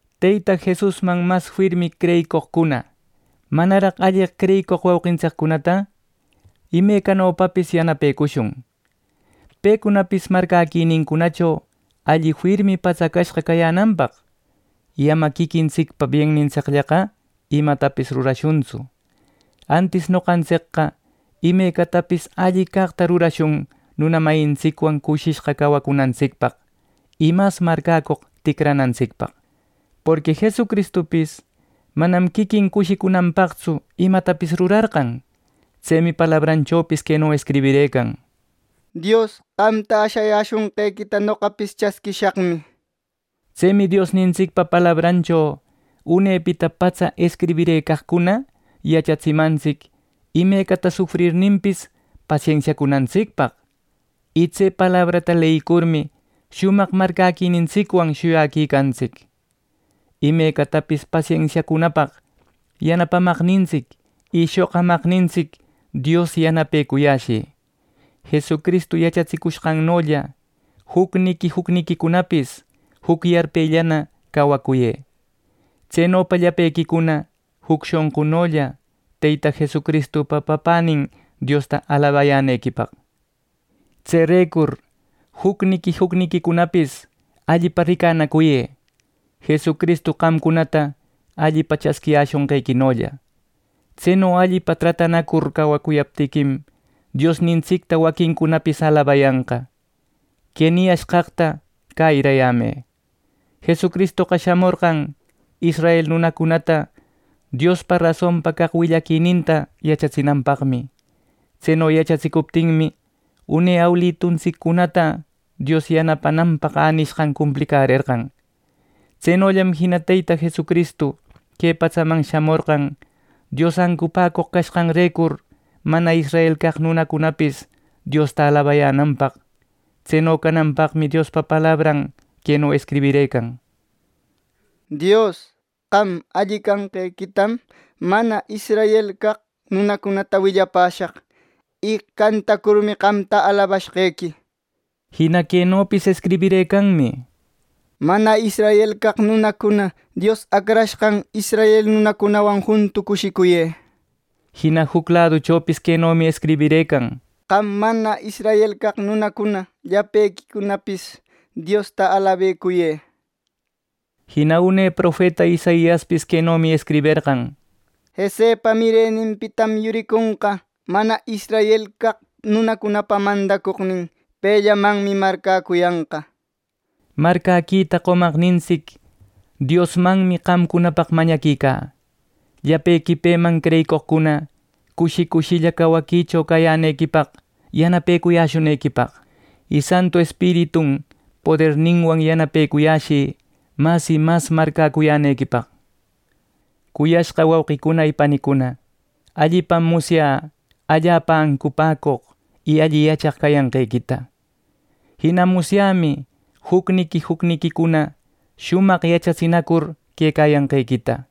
Teyta Jesusman mas firmi creyicoqcuna manaraq alleq creyicoq wauqintsiccunata imecanopapis yanapecushun, pecunapis marcäquinincunacho alli firmi patsacashqa cayänanpaq. Y ama quiquintsicpa biennintsicllaqa imatapis rurashuntsu. Antis noqantsicqa imecatapis alli caqta rurashun nuna mayintsicwan cushishqa cawacunantsicpaq, y mas marcäcoq ticranantsicpaq. Porqui Jesucristupis manam quiquin cushicunanpaqtsu imatapis rurarqan. Tsemi palabranchopis queno escribirëcan: “¡Dios, Qamta ashayäshonqequita, noqapis chasquishaqmi!” nir. Tsemi Diosnintsicpa palabrancho unepita patsa escribirëcaqcuna yachatsimantsic imecata sufrirninpis pasensiacunantsicpaq, y tse palabranta leyicurmi shumaq marcäquinintsicwan shuyaquicantsic. Imecatapis pasensiacunapaq yanapamaqnintsic y shoqamaqnintsic Dios yanapecuyäshï. Jesucristu yachatsicushqannolla jucniqui jucniquicunapis juc yarpellana cawacuyë, tsenopa llapequicuna juc shonqunolla Teyta Jesucristupa Papänin Diosta alabayänequipaq. Tserecur jucniqui jucniquicunapis allipa ricanacuyë, Jesucristu qamcunata allipa chasquiyäshonqequinolla. Tseno allipa tratanacur cawacuyaptiquim, Diosnintsicta waquincunapis alabayanqa. Que niyashqaqta cäyirayämë: Jesucristoqa shamorqan israel nunacunata Diospa rasonpa caq willaquininta yachatsinanpaqmi. Tseno yachatsicuptinmi, une awiluntsiccunata Dios yanapananpaq änishqan cumplicärerqan. Tsenollam jina Teyta Jesucristu que patsaman shamorqan Dios ancupäcoq cashqanrecur mana israel caq nunacunapis Diosta alabayänanpaq. Tseno cananpaqmi Diospa palabran queno escribirëcan: “Dios, Qam alli canqequitam mana israel caq nunacunata willapäshaq y cantacurmi qamta alabashqequi” nir. Jina quenopis escribirëcanmi: “Mana israel caq nunacuna Dios acrashqan israel nunacunawan juntu cushicuyë” nir. Jina juc laduchopis quenomi escribirëcan: “Qam mana israel caq nunacuna llapequipis Diosta alabecuyë” nir. Jina une profeta Isaiaspis quenomi escribirëcan: “Jesepa mireninpitam yuriconqa mana israel caq nunacunapa mandacoqnin. Pellamanmi marcäcuyanqa” nir. Marcäquita qomaqnintsic Diosmanmi qamcunapaq mañaquicä, llapequi peman creyicoqcuna cushi cushilla cawaquicho cayänequipaq yanapecuyäshunequipaq. Y Santu Espiritun poderninwan yanapecuyäshï mas y mas marcäcuyänequipaq. Cuyashqa wauqicuna y panicuna, allipam musyä allapa ancupäcoq y alli yachaq cayanqequita. Jina musyämi jucniqui jucninqui shumaq yachatsinacur quecayanqequita.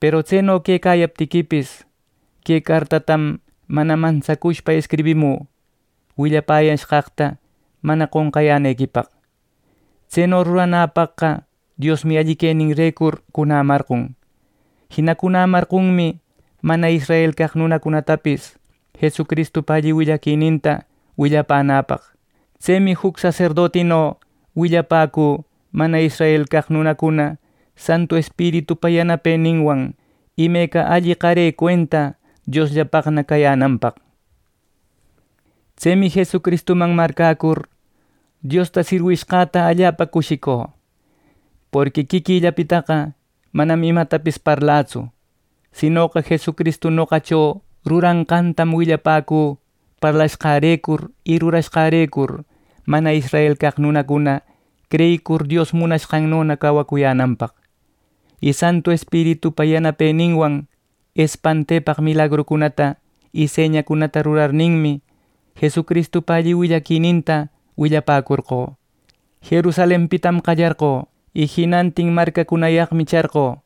Peru tseno quecayaptiquipis, que cartatam mana mantsacushpa escribimü willapäyashqaqta mana qonqayänequipaq. Tseno ruranäpaqqa Diosmi alli queninrecur cunämarqon. Jina cunämarqonmi mana israel caq nunacunatapis Jesucristupa alli willaquininta willapänäpaq. Tsemi juc saserdotino willäpäcü mana israel caq nunacuna Santu Espiritupa yanapeninwan, imeca alli qare cuenta Diosllapaqna cayänanpaq. Tsemi Jesucristuman marcäcur Diosta sirwishqäta allapa cushicu. Porqui quiquillapitaqa manam imatapis parlatsu. Sinoqa Jesucristu noqacho ruranqantam willapäcü parlashqärecur y rurashqärecur mana israel caq nunacuna creyicur Dios munashqannona cawacuyänanpaq. Y Santu Espiritupa yanapeninwan espantepaq milagrucunata y señacunata rurarninmi, Jesucristupa alli willaquininta willapäcorqö. Jerusalenpitam qallarqö, y jinantin marcacunayaqmi charqö,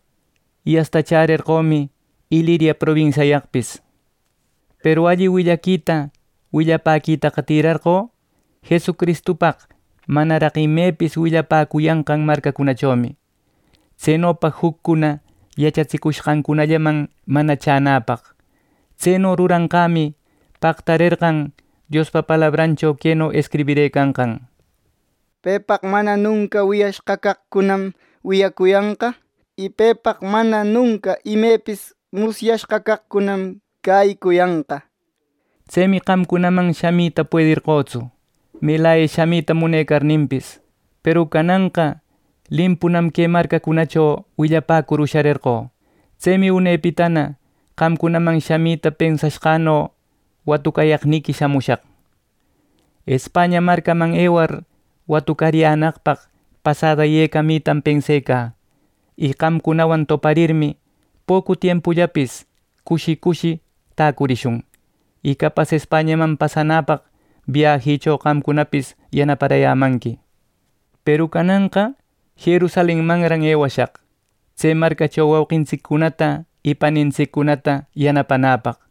y asta chärerqömi Iliria probinsiayaqpis. Peru alli willaquita willapäquitaqa tïrarqö Jesucristupaq manaraq imepis willapäcuyanqan marcacunachomi, tsenopa juccuna yachatsicuyashqanllaman mana chänäpaq. Tseno ruranqämi pactarerqan Diospa palabrancho queno escribirëcanqan: “Pepaq mana nunca wiyayashqa caqcunam wiyayanqa. Y pepaq mana nunca imepis musyashqa caqcunam cäyicuyanqa” nir. Tsemi qamcunaman shamita puederqötsu, melaya shamita munecarninpis. Peru cananqa limpunam que marcacunacho willapäcur usharerqö. Tsemi unepitana qamcunaman shamita pensashqäno watucayaqniqui shamushaq. España marcaman ewar watucariyänaqpaq pasada yecaramitam pensecä. Y qamcunawan toparirmi, pocu tiempullapis cushi cushi täcurishun. Y capas Españaman pasacunäpaq biajïcho qamcunapis yanaparayämanqui. Peru cananqa Jerusalenmanran ewashaq tse marcacho wauqintsiccunata y panintsiccunata yanapanäpaq.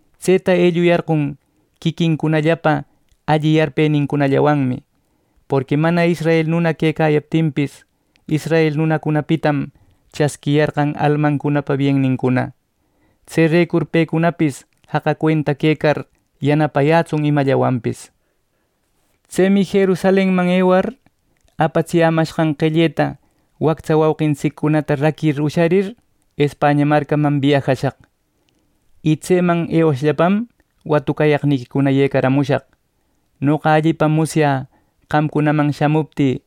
Tseta elluyarqon quiquincunallapa alli yarpenincunawanmi, porqui mana israel nuna quecayaptinpis, israel nunacunapitam chasquiyarqan almancunapa bienincuna. Tserecur pecunapis jaqa cuenta quecar yanapayätsun imallawanpis. Tsemi Jerusalenman ewar, apatsiyämashqan qelleta wactsa wauqintsiccunata raquir usharir, España marcaman biajashaq, y tseman ewashllapam watucayaqniquicuna yecaramushaq. Noqa allipam musyä qamcunaman shamuptï,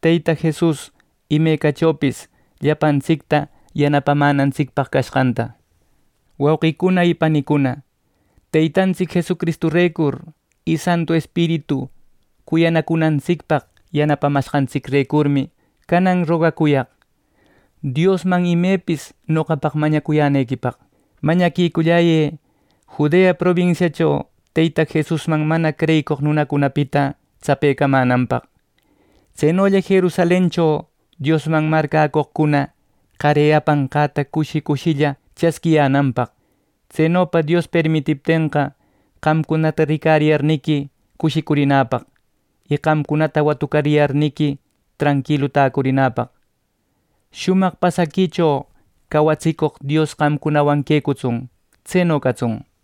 Teyta Jesus imecachopis llapantsicta yanapamänantsicpaq cashqanta. Wauqicuna y panicuna, Teytantsic Jesucristurecur y Santu Espiritu cuyanacunantsicpaq yanapamashqantsicrecurmi canan rogacuyaq Diosman imepis noqapaq mañacuyänequipaq. Mañaquiculläyë Judea probinsiacho Teyta Jesusman mana creyicoq nunacunapita tsapecamänanpaq, tsenolla Jerusalencho Diosman marcäcoqcuna qare apanqäta cushi cushilla chasquiyänanpaq. Tsenopa Dios permitiptenqa, qamcunata ricariyarniqui cushicurinäpaq, y qamcunata watucariyarniqui tranquilu täcurinäpaq. Shumaq pasaquicho cawatsicoq Dios qamcunawan quecatsun. Tseno catsun.